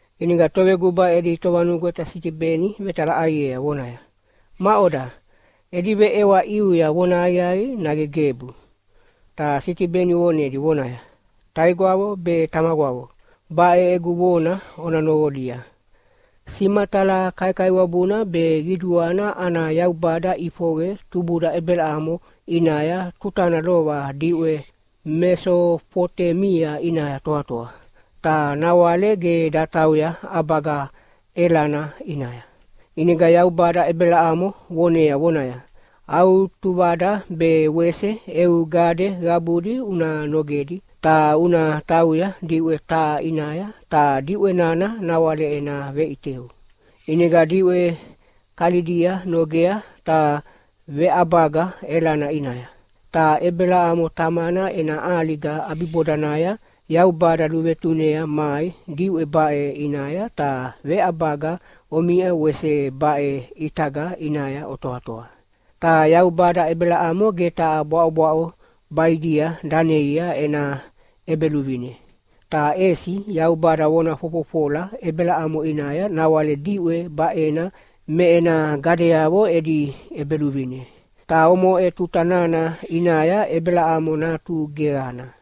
ʼInega toveguba edi tovanugweta Sitibeni vetalaʼaiea vonaya, “Maʼoda, edi veʼewa ʼiuya vonahaqiaqi nage gebu?” Ta Sitibeni vonedi vonaya, “Taigwavo be tamagwavo, baʼe egu vona ona noqolia. Simatala kaikaiwabuna be qiduana ana Yaubada ʼifoqe tubuda Ebelamo ʼinaya tutana lova diʼwe Mesofotemia ʼinaya toatoa, ta nawale ge datauya ʼabaga Elana ʼinaya. ʼInega Yaubada Ebelamo vonea vonaya, ‘Au tuvada be wese eu gade qabudi una nogedi, ta una tauya diʼwe taha ʼinaya ta diʼwe nana nawale ena veʼiteu.’ “ʼInega diʼwe Kalidia nogea ta veʼabaga Elana ʼinaya. Ta Ebelamo tamana ena ʼaliga ʼabibodanaya Yaubada luvetunea mai diʼwe baʼe ʼinaya ta veʼabaga omiʼa wese baʼe ʼitaga ʼinaya otoatoa. Ta Yaubada Ebelamo ge taha bwaʼobwaʼo baʼidia daneia ena ʼebeluvine. Ta ʼesi Yaubada vona fofofola Ebelamo ʼinaya nawale diʼwe baʼena me ena gadeavo edi ʼebeluvine. Ta omoʼe tuta nana ʼinaya Ebelamo natu geqana.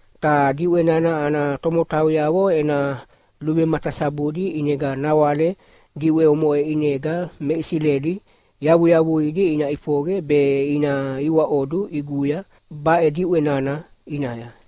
Ta diʼwe nana ana tomotauyavo ena luvematasabudi ʼinega nawale diʼwe omoʼe ʼinega me Isileli yavuyavuidi ina ʼifoqe be ina iwaʼodu ʼiguya baʼe diʼwe nana ʼinaya.’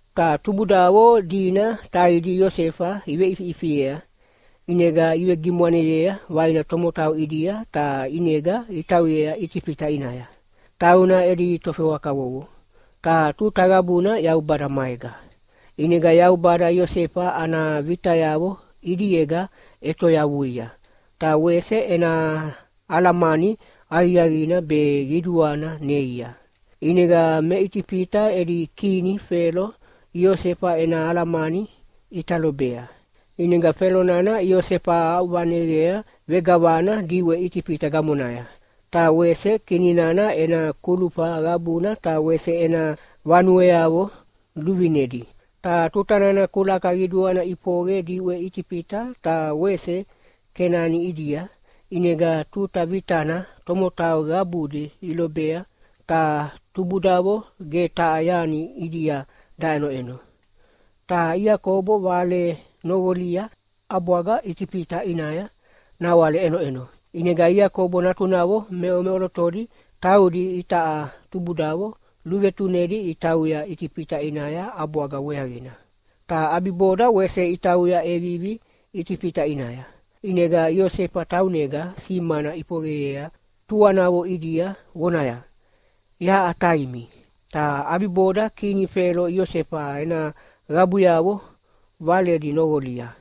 “Ta tubudavo dina taidi Iosefa iveʼifiʼifiea, ʼinega ivegimwaneyea vaina tomotau ʼidia ta ʼinega itauyea Itifita ʼinaya. Tauna edi tofewa kavovo, ta tuta qabuna Yaubada maega. ʼInega Yaubada Iosefa ana vitayavo ʼidiega ʼetoyavuia, ta wese ena alamani aqiaqina be qiduana neia. ʼInega me Itifita edi kini Felo Iosefa ena alamani ʼita lobea. ʼInega Felo nana Iosefa aʼuvaneqea vegavana diʼwe Itifita gamonaya, ta wese kini nana ena kulufa qabuna ta wese ena vanueavo luvinedi. Ta tuta nana kulaka qiduana ʼifoqe diʼwe Itifita ta wese Kenani ʼidia, ʼinega tuta vitana tomotau qabudi ilobea, ta tubudavo ge taha yani ʼidia daʼenoʼeno. Ta Iakobo vale noqolia ʼabwaga Itifita ʼinaya nawale ʼenoʼeno. ʼInega Iakobo natunavo meʼomeʼolotodi taudi itaʼa tubudavo luvetunedi itauya Itifita ʼinaya ʼabwaga weaqina. Ta ʼabiboda wese itauya ʼevivi Itifita ʼinaya, ʼinega Iosefa taunega simana ʼifoqeyea tuanavo ʼidia vonaya, ‘Yaʼa taimi.’ Ta ʼabiboda kini Felo Iosefa ena qabuyavo valedi noqolia.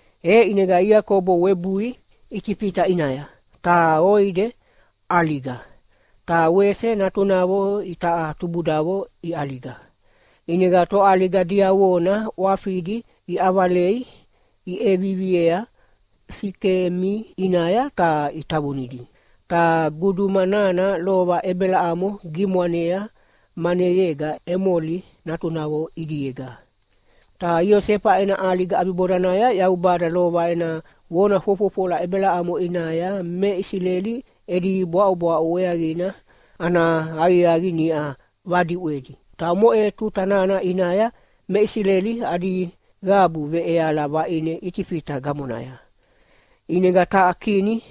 E ʼinega Iakobo webui Itifita ʼinaya, ta ʼoide ʼaliga, ta wese natunavo itaʼa tubudavo iʼaliga. ʼInega toʼaliga diavona ʼwafidi iʼavalei iʼeviviea Sikemi ʼinaya ta itavunidi. Ta guduma nana lova Ebelamo gimwanea maneyega Emoli natunavo ʼidiega. “Ta Iosefa ena ʼaliga ʼabibodanaya Yaubada lova ena vona fofofola Ebelamo ʼinaya me Isileli edi bwaʼobwaʼo weaqina ana aqiaqi niʼa vadiʼwedi. Ta omoʼe tuta nana ʼinaya me Isileli adi qabu veʼeala vaʼine Itifita gamonaya. ʼInega taha kini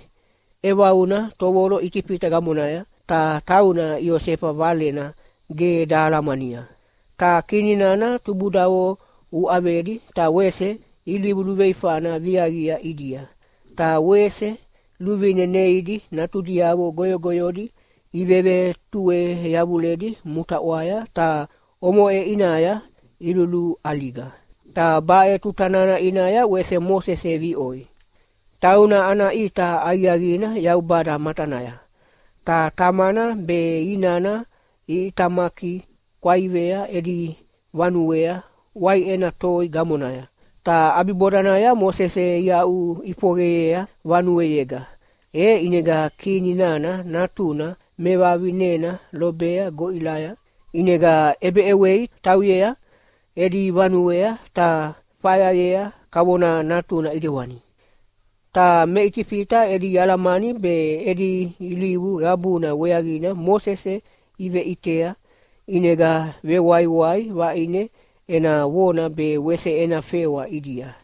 ʼevauna tovolo Itifita gamonaya, ta tauna Iosefa valena ge dahalamania. Ta kini nana tubudavo uʼavedi ta wese ilivu luveifana viaqia ʼidia, ta wese luvine neidi natudiavo goyogoyodi ivevetue yavuledi mutaʼwaya ta omoʼe ʼinaya iluluʼaliga. Ta baʼe tuta nana ʼinaya wese Mosese viʼoi. Tauna ana ʼita aqiaqina Yaubada matanaya, ta tamana be inana iʼitamaki kwaivea edi vanuea waiʼena toi gamonaya. Ta ʼabibodanaya Mosese iaʼuʼifoqeyea vanuega, e ʼinega kini nana natuna mevavinena lobea goʼilaya. ʼInega ʼebeʼewei tauyea edi vanuea ta fayayea kavona natuna ʼidewani. Ta me Itifita edi alamani be edi ilivu qabuna weaqina Mosese iveʼitea, ʼinega vewaiwai vaʼine ena vona be wese ena fewa ʼidia.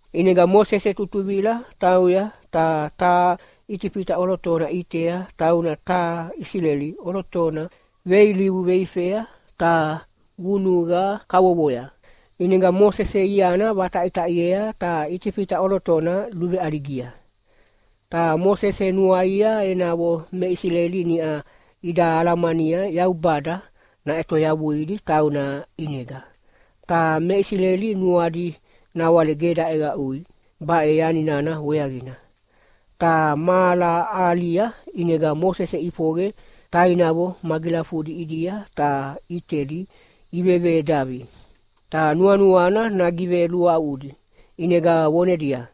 ʼInega Mosese tutuvila tauya ta taha Itifita ʼolotona ʼitea tauna taha Isileli ʼolotona veilivu veifea ta vunuqa kavovoya. ʼInega Mosese iana vataʼitaʼiea ta Itifita ʼolotona luveʼaligia. “Ta Mosese nuaia enavo me Isileli niʼa ida alamania Yaubada naʼetoyavuidi tauna ʼinega, ta me Isileli nuadi nawale ge daʼeqaʼui baʼe yani nana weaqina. Ta mahala ahalia ʼinega Mosese ʼifoqe tainavo magilafudi ʼidia ta ʼitedi ivevedavi. Ta nuanuana nagiveluaʼudi ʼinega vonedia,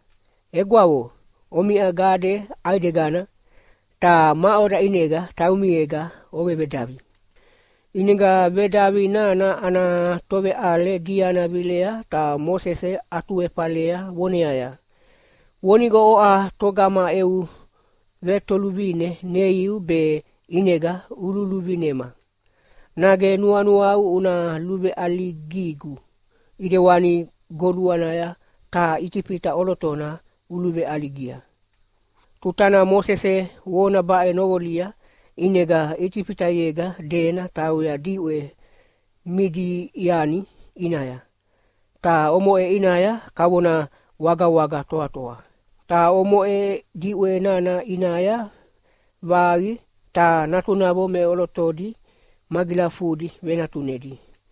‘Egwavo omiʼa gade ʼaidegana, ta maʼoda ʼinega taumiega ovevedavi?’ “ʼInega vedavi nana ana toveʼale diana vilea ta Mosese atuefalea voneaya, ‘Vonigo oʼa togama eu vetoluvine neiu be ʼinega ululuvinema! Nage nuanuau una luveʼaligigu ʼidewani goluanaya taha Itifita ʼolotona uluveʼaligia?’ Tutana Mosese vona baʼe noqolia, ʼinega Itifitayega dena tauya diʼwe Midiani ʼinaya, ta omoʼe ʼinaya kavona wagawaga toatoa. Ta omoʼe diʼwe nana ʼinaya vaqi ta natunavo meʼolotodi magilafudi venatunedi.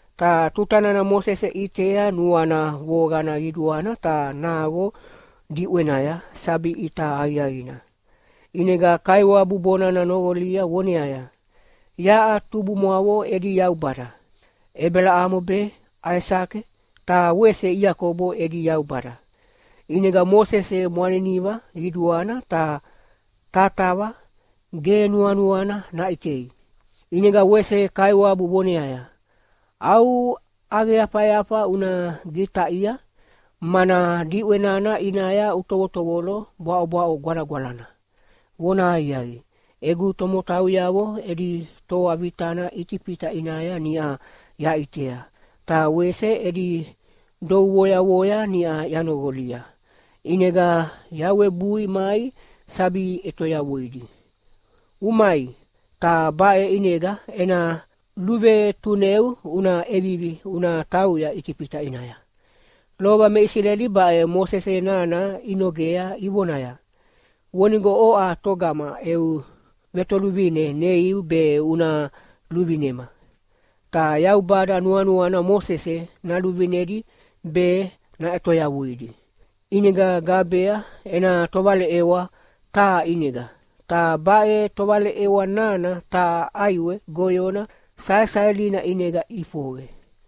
Ta tuta nana Mosese ʼitea nuana voqana qiduana ta naqo diʼwenaya sabi ʼita aqiaqina. ʼInega Kaiwabu bonana noqolia voneaya, ‘Yaʼa tubumwavo edi Yaubada. Ebelamo be, Aisake ta wese Iakobo edi Yaubada.’ ʼInega Mosese mwaniniva qiduana ta tatava ge nuanuana naʼitei. ʼInega wese Kaiwabu voneaya, ‘Au ʼaqeyafayafa una gitaʼia, mana diʼwe nana ʼinaya utovotovolo bwaʼobwaʼo gwalagwalana. Vonahaqiaqi, egu tomotauyavo edi toa vitana Itifita ʼinaya niʼa yaʼitea, ta wese edi duvoyavoya niʼa yanoqolia, ʼinega yawebui mai sabi ʼetoyavuidi. Umai, ta baʼe ʼinega ena luvetuneu una ʼevivi una tauya Itifita ʼinaya.’ “Lova me Isileli baʼe Mosese nana inogea ivonaya, ‘Vonigo oʼa togama eu vetoluvine neiu be una luvinema?’ Ta Yaubada nuanuana Mosese naluvinedi be naʼetoyavuidi, ʼinega gabea ena tovaleʼewa taha ʼinega, ta baʼe tovaleʼewa nana taha ʼaiwe goyona saesaelina ʼinega ʼifoqe.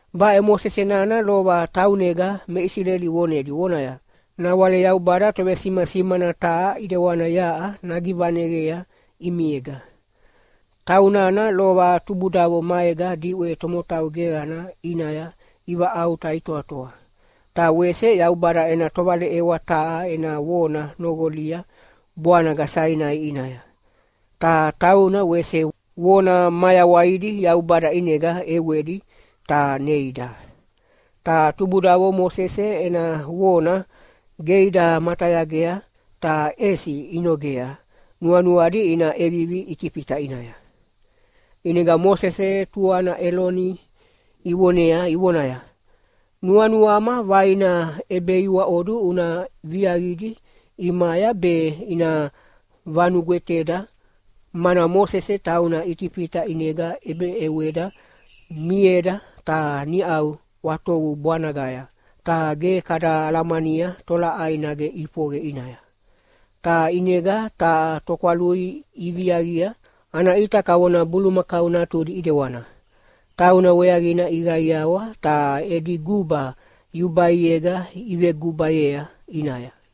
Baʼe Mosese nana lova taunega me Isileli vonedi vonaya, ‘Nawale Yaubada tovesimasimana taha ʼidewana yaʼa nagivaneqea ʼimiega.’ Taunana lova tubudavo maega diʼwe tomotau geqana ʼinaya ivaʼauta itoatoa. Ta wese Yaubada ena tovaleʼewa taha ena vona noqolia bwanaga Sainai ʼinaya. Ta tauna wese vona mayawaidi Yaubada ʼinega ʼewedi ta neida. “Ta tubudavo Mosese ena vona ge ida matayagea, ta ʼesi inogea nuanuadi ina ʼevivi Itifita ʼinaya. ʼInega Mosese tuana Eloni ivonea ivonaya, ‘Nuanuama vaina ʼebeiwaʼodu una viaqidi ʼimaya be ina vanugweteda, mana Mosese tauna Itifita ʼinega ʼebeʼeweda mieda ta niʼau ʼwatovu bwanagaya, ta ge kada alamania tolaʼai nage ʼifoqe ʼinaya.’ Ta ʼinega taha tokwalui iviaqia, ana ʼita kavona bulumakau natudi ʼidewana. Tauna weaqina iqaiawa ta edi guba yubaiega ivegubayea ʼinaya.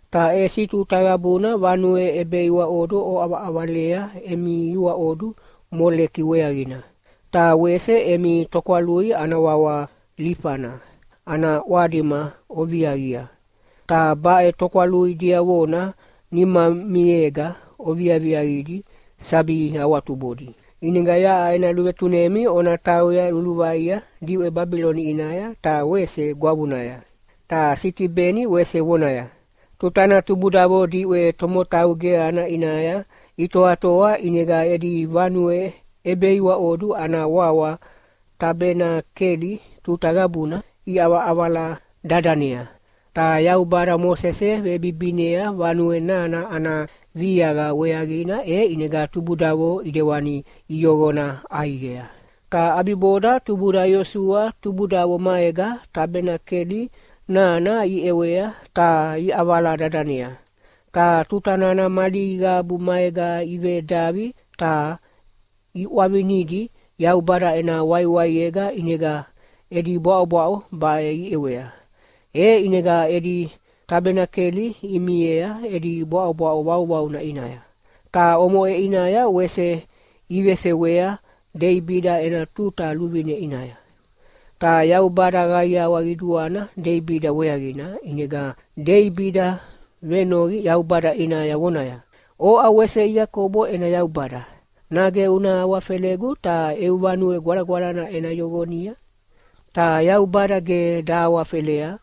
Ta ʼesi tuta qabuna vanue ʼebeiwaʼodu oʼavaʼavalea emi iwaʼodu Moleke weaqina. Ta wese emi tokwalui ana wawa Lifana ana ʼwadima oviaqia, ta baʼe tokwalui diavona nimamiega oviaqidi sabi awatubodi. ʼInega yaʼa ena luvetunemi ona tauya luluvaia diʼwe Babiloni ʼinaya ta wese gwavunaya.’” Ta Sitibeni wese vonaya, “Tutana tubudavo diʼwe tomotau geqana ʼinaya itoatoa ʼinega edi vanue ʼebeiwaʼodu ana wawa Tabenakeli tuta qabuna iʼavala dadanea. Ta Yaubada Mosese vebibinea vanue nana ana viaqa weaqina e ʼinega tubudavo ʼidewani iyoqona ʼaiqea. Ta ʼabiboda tubuda Iosua tubudavo maega Tabenakeli nana iʼewea ta iʼavala dadanea. Ta tuta nana mali qabu maega ivedavi ta iʼwavinidi Yaubada ena waiwaiega ʼinega edi bwaʼobwaʼo baʼe iʼewea. E ʼinega edi Tabenakeli imiea edi bwaʼobwaʼo vauvauna ʼinaya. Ta omoʼe ʼinaya wese ivefewea Deibida ena tuta luvine ʼinaya. Ta Yaubada qaiawa qiduana Deibida weaqina, ʼinega Deibida venoqi Yaubada ʼinaya vonaya, ‘Oʼa wese Iakobo ena Yaubada, nage una awafelegu ta eu Vanue Gwalagwalana ena yoqonia?’ Ta Yaubada ge dahawafelea,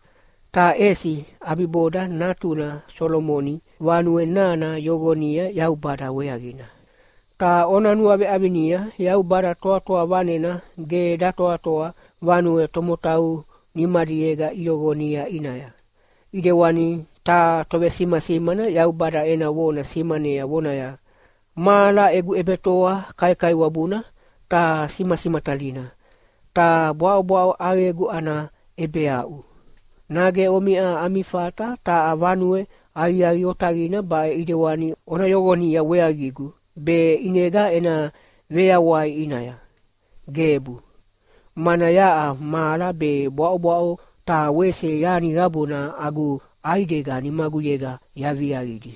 ta ʼesi ʼabiboda natuna Solomoni vanue nana yoqonia Yaubada weaqina. Ta ona nuaveʼavinia, Yaubada Toatoa Vanena ge datoatoa vanue tomotau nimadiega iyoqonia ʼinaya. ʼIdewani taha tovesimasimana Yaubada ena vona simanea vonaya, ‘Mahala egu ʼebetoa kaikaiwabuna ta simasimatalina, ta bwaʼobwaʼo ʼaqegu ana ʼebeaʼu. Nage omiʼa ami fata taha vanue aqiaqi otaqina baʼe ʼidewani ona yoqonia weaqigu be ʼinega ena veyawai ʼinaya? Gebu! Mana yaʼa mahala be bwaʼobwaʼo ta wese yani qabuna agu ʼaidega nimaguyega yaviaqidi!’”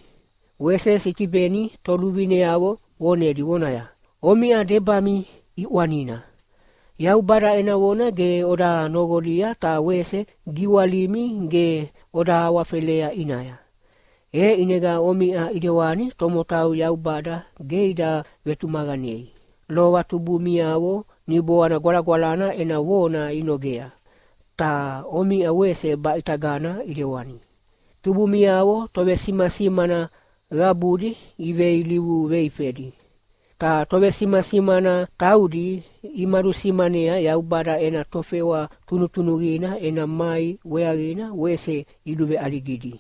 Wese Sitibeni toluvineavo vonedi vonaya, “Omiʼa debami ʼiʼwanina! Yaubada ena vona ge oda noqolia ta wese giwalimi ge oda awafelea ʼinaya. E ʼinega omiʼa ʼidewani tomotau Yaubada ge ida vetumaqanei. Lova tubumiavo Niboana Gwalagwalana ena vona inogea, ta omiʼa wese baʼitagana ʼidewani. Tubumiavo tovesimasimana qabudi iveilivu veifedi. Ta tovesimasimana taudi imadusimanea Yaubada ena tofewa tunutunuqina ena mai weaqina wese iluveʼaligidi.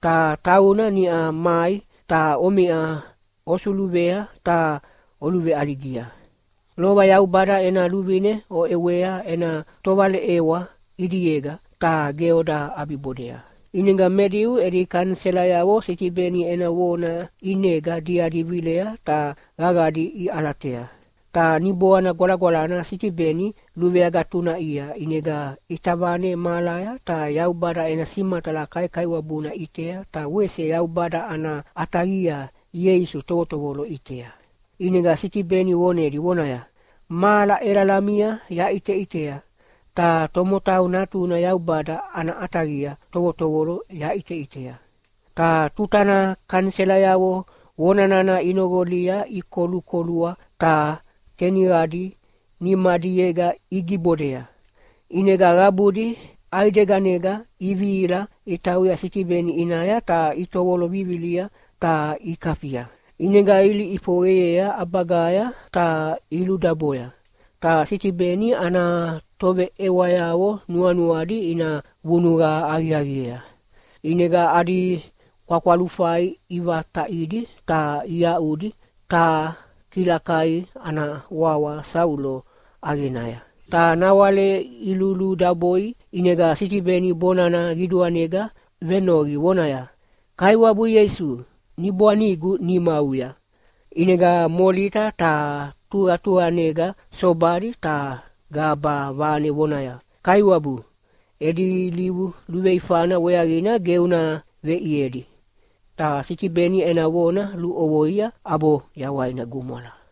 Ta tauna niʼa mai ta omiʼa osuluvea ta oluveʼaligia. Lova Yaubada ena luvine oʼewea ena tovaleʼewa ʼidiega, ta ge oda ʼabibodea.” ʼInega me Diu edi kaniselayavo Sitibeni ena vona ʼinega diadi vilea ta qaqadi iʼalatea. Ta Niboana Gwalagwalana Sitibeni luveagatunaʼia ʼinega ʼita vane mahalaya ta Yaubada ena simatala kaikaiwabuna ʼitea ta wese Yaubada ana ʼataqia Ieisu tovotovolo ʼitea. ʼInega Sitibeni vonedi vonaya, “Mahala ʼelalamina yaʼiteʼitea, ta Tomotau Natuna Yaubada ana ʼataqia tovotovolo yaʼiteʼitea.” Ta tutana kaniselayavo vonana inoqolia ikolukolua ta teniqadi nimadiega igibodea, ʼinega qabudi ʼaideganega ivihila itauya Sitibeni ʼinaya ta itovolo vivilia ta ikafia. ʼInega ilihi ʼifoqeyea ʼabagaya ta iludaboya. Ta Sitibeni ana toveʼewayavo nuanuadi ina vunuqa aqiaqiea, ʼinega adi kwakwalufai ivataʼidi ta iaʼudi taha kilakai ana wawa Saulo ʼaqenaya. Ta nawale iluludaboi ʼinega Sitibeni bonana qiduanega venoqi vonaya, “Kaiwabu Ieisu, Niboanigu nimauya.” ʼInega molita ta tuqatuqanega sobadi ta gaba vane vonaya, “Kaiwabu, edi ilivu luveifana weaqina ge una veʼiedi.” Ta Sitibeni ena vona luʼovoia ʼabo yawaina gumwala.